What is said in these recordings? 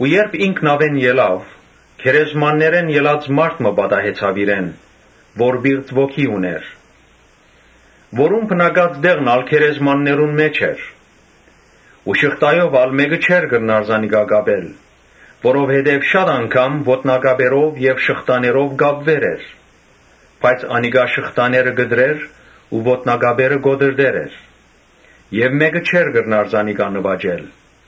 Երբ ինք նաւէն ելաւ, գերեզմաններէն ելած մարդ մը պատահեցաւ իրեն, որ պիղծ ոգի ունէր, Որուն բնակած տեղն ալ գերեզմաններուն մէջ էր ու շղթայով ալ մէկը չէր կրնար զանիկա կապել, Որովհետեւ շատ անգամ ոտնակապերով եւ շղթաներով կապուեր էր, բայց անիկա շղթաները կտրեր ու ոտնակապերը կոտրտեր էր եւ մէ՛կը չէր կրնար զանիկա նուաճել։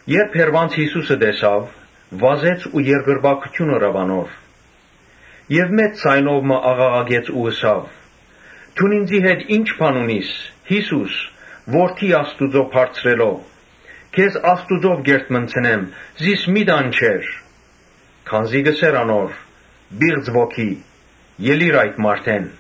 Երբ հեռուէն Յիսուսը տեսաւ, վազեց ու երկրպագութիւն ըրաւ անոր Եւ մեծ ձայնով մը աղաղակեց ու ըսաւ. «Դուն ինծի հետ ի՞նչ բան ունիս, Յիսո՛ւս, Որդի Բարձրեալ Աստուծոյ, քեզ Աստուծմով կ’երդմնցնեմ, զիս մի՛ տանջեր»։ (Քանզի կ’ըսէր անոր. ‘Պի՛ղծ ոգի, ելիր այդ մարդէն’։)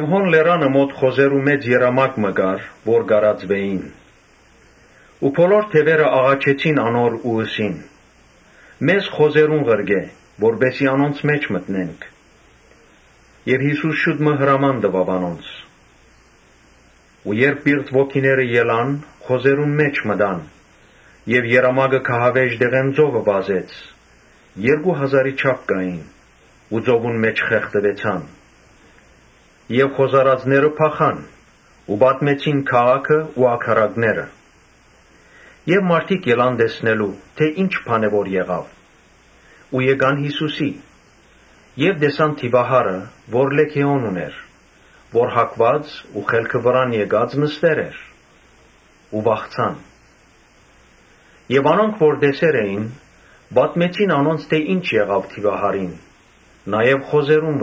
Հոն լերանը մօտ խոզերու մեծ երամակ մը կար՝ որ կ’արածէին։ Բոլոր դեւերը աղաչեցին անոր ու ըսին. «Մեզ խոզերուն ղրկէ, որպէս զի անոնց մէջ մտնենք»։ Յիսուս հրաման տուաւ անոնց։ Երբ պիղծ ոգիները ելան, խոզերուն մէջ մտան եւ երամակը գահավէժ տեղէն ծովը վազեց, (երկու հազարի չափ կային,) ու ծովուն մէջ խեղդուեցան։ Խոզարածները փախան ու պատմեցին՝ քաղաքը ու ագարակները եւ մարդիկ եկան տեսնելու՝ թէ ի՛նչ է եղած։ Եկան Յիսուսի քով, տեսան դիւահարը, որ լէգէոն ունէր, որ հագուած ու խելքը վրան եկած նստեր էր ու վախցան։ Անոնք որ տեսեր էին, պատմեցին անոնց թէ ի՞նչ եղաւ դիւահարին, նաեւ խոզերուն։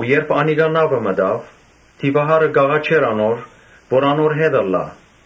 Երբ անիկա նաւը մտաւ, դիւահարը կ’աղաչէր անոր՝ որ անոր հետ երթայ,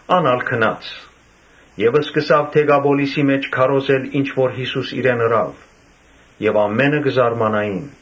Ան ալ գնաց եւ սկսաւ Դեկապոլիսի մէջ պատմել ինչ որ Յիսուս իրեն ըրաւ։ Ամէնքը կը զարմանային։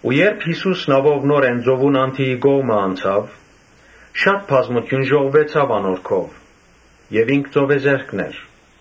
Երբ Յիսուս նաւով նորէն ծովուն անդիի կողմը անցաւ, շատ բազմութիւն ժողվուեցաւ անոր քով եւ ինք ծովեզերքն էր։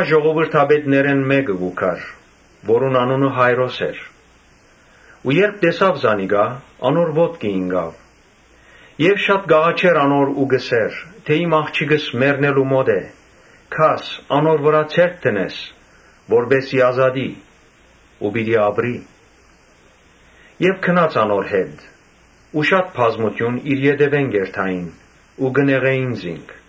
Ժողովրդապետներէն մէկը եկաւ, որուն անունը Յայրոս էր։ Երբ տեսաւ Յիսուսը, անոր ոտքը ինկաւ, Աղաչեց անոր ու ըսաւ. «Իմ աղջիկս մեռնելու մօտ է, եկո՛ւր, անոր վրայ ձեռք դիր, որպէս զի ազատի ու պիտի ապրի»։ Ան ալ գնաց անոր հետ ու շատ բազմութիւն իր ետեւէն կ’երթային ու կը նեղէին զինք։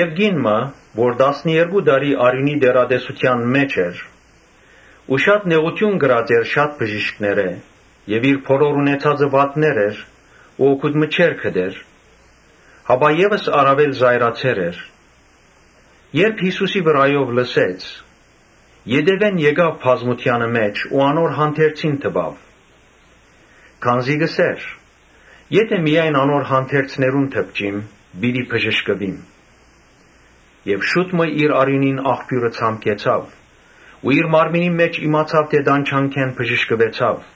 Կին մը, որ տասներկու տարի արիւնի տեռատեսութեան մէջ էր Ու շատ նեղութիւն կրած էր շատ բժիշկներէ եւ իր բոլոր ունեցածը վատներ էր ու օգուտ մը չէր գտեր, հապա ալ աւելի սաստկացեր էր, Երբ Յիսուսի վրայով լսեց, ետեւէն եկաւ բազմութեանը մէջ ու անոր հանդերձին դպաւ. Քանզի կ’ըսէր. «Եթէ միայն անոր հանդերձներուն դպչիմ, պիտի բժշկուիմ»։ Շուտ մը իր արիւնին աղբիւրը ցամքեցաւ ու իր մարմնին մէջ իմացաւ թէ տանջանքէն բժշկուեցաւ։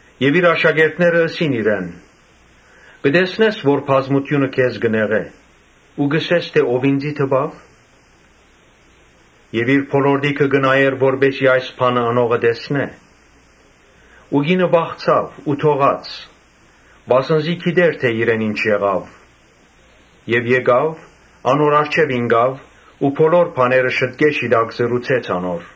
Աշակերտները ըսին իրեն. «Կը տեսնես թէ բազմութիւնը քեզ կը նեղէ ու կ’ըսես թէ՝ ‘Ո՞վ ինծի դպաւ’»։ Յիսուս իր բոլորտիքը նայեցաւ, որպէս զի այս բանը ընողը տեսնէ։ Կինը վախցաւ ու դողաց, վասն զի գիտէր թէ իրեն ի՛նչ եղաւ եւ եկաւ՝ անոր առջեւ ինկաւ ու բոլոր բաները շիտկէ շիտակ ըսաւ անոր։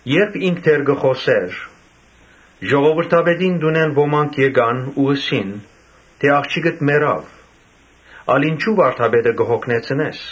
Երբ ինք դեռ կը խօսէր, ժողովրդապետին տունէն ոմանք եկան ու ըսին. «Աղջիկդ մեռաւ, ալ ինչո՞ւ վարդապետը կը յոգնեցնես»։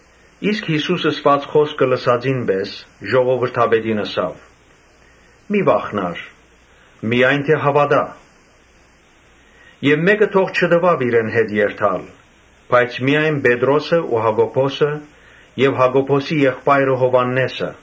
Իսկ Յիսուս ըսուած խօսքը լսելուն պէս ժողովրդապետին ըսաւ. «Մի՛ վախնար, միայն հաւատա»։ Եւ մէկը թող չտուաւ որ իրեն հետ երթայ, միայն Պետրոսն ու Յակոբոսը եւ Յակոբոսին եղբայրը՝ Յովհաննէսը։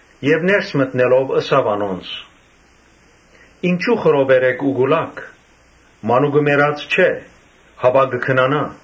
Ներս մտնելով՝ ըսաւ անոնց. «Ինչո՞ւ խռովեր էք ու կու լաք. մանուկը մեռած չէ, հապա կը քնանայ»։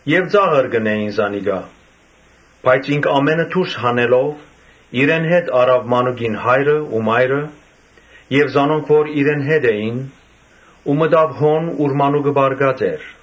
Ոմանք ծաղր կ’ընէին զանիկա. բայց ինք ամէնքը դուրս հանելով՝ իրեն հետ առաւ մանուկին հայրն ու մայրը եւ զանոնք որ իրեն հետ էին ու մտաւ հոն՝ ուր մանուկը պառկած էր։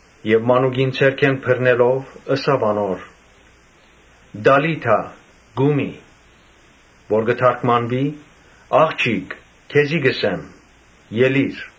Մանուկին ձեռքէն բռնելով՝ ըսաւ անոր. «Տալի՛թա, կո՛ւմի». որ կը թարգմանուի՝ «Աղջի՛կ, (քեզի կ’ըսեմ,) ելիր»։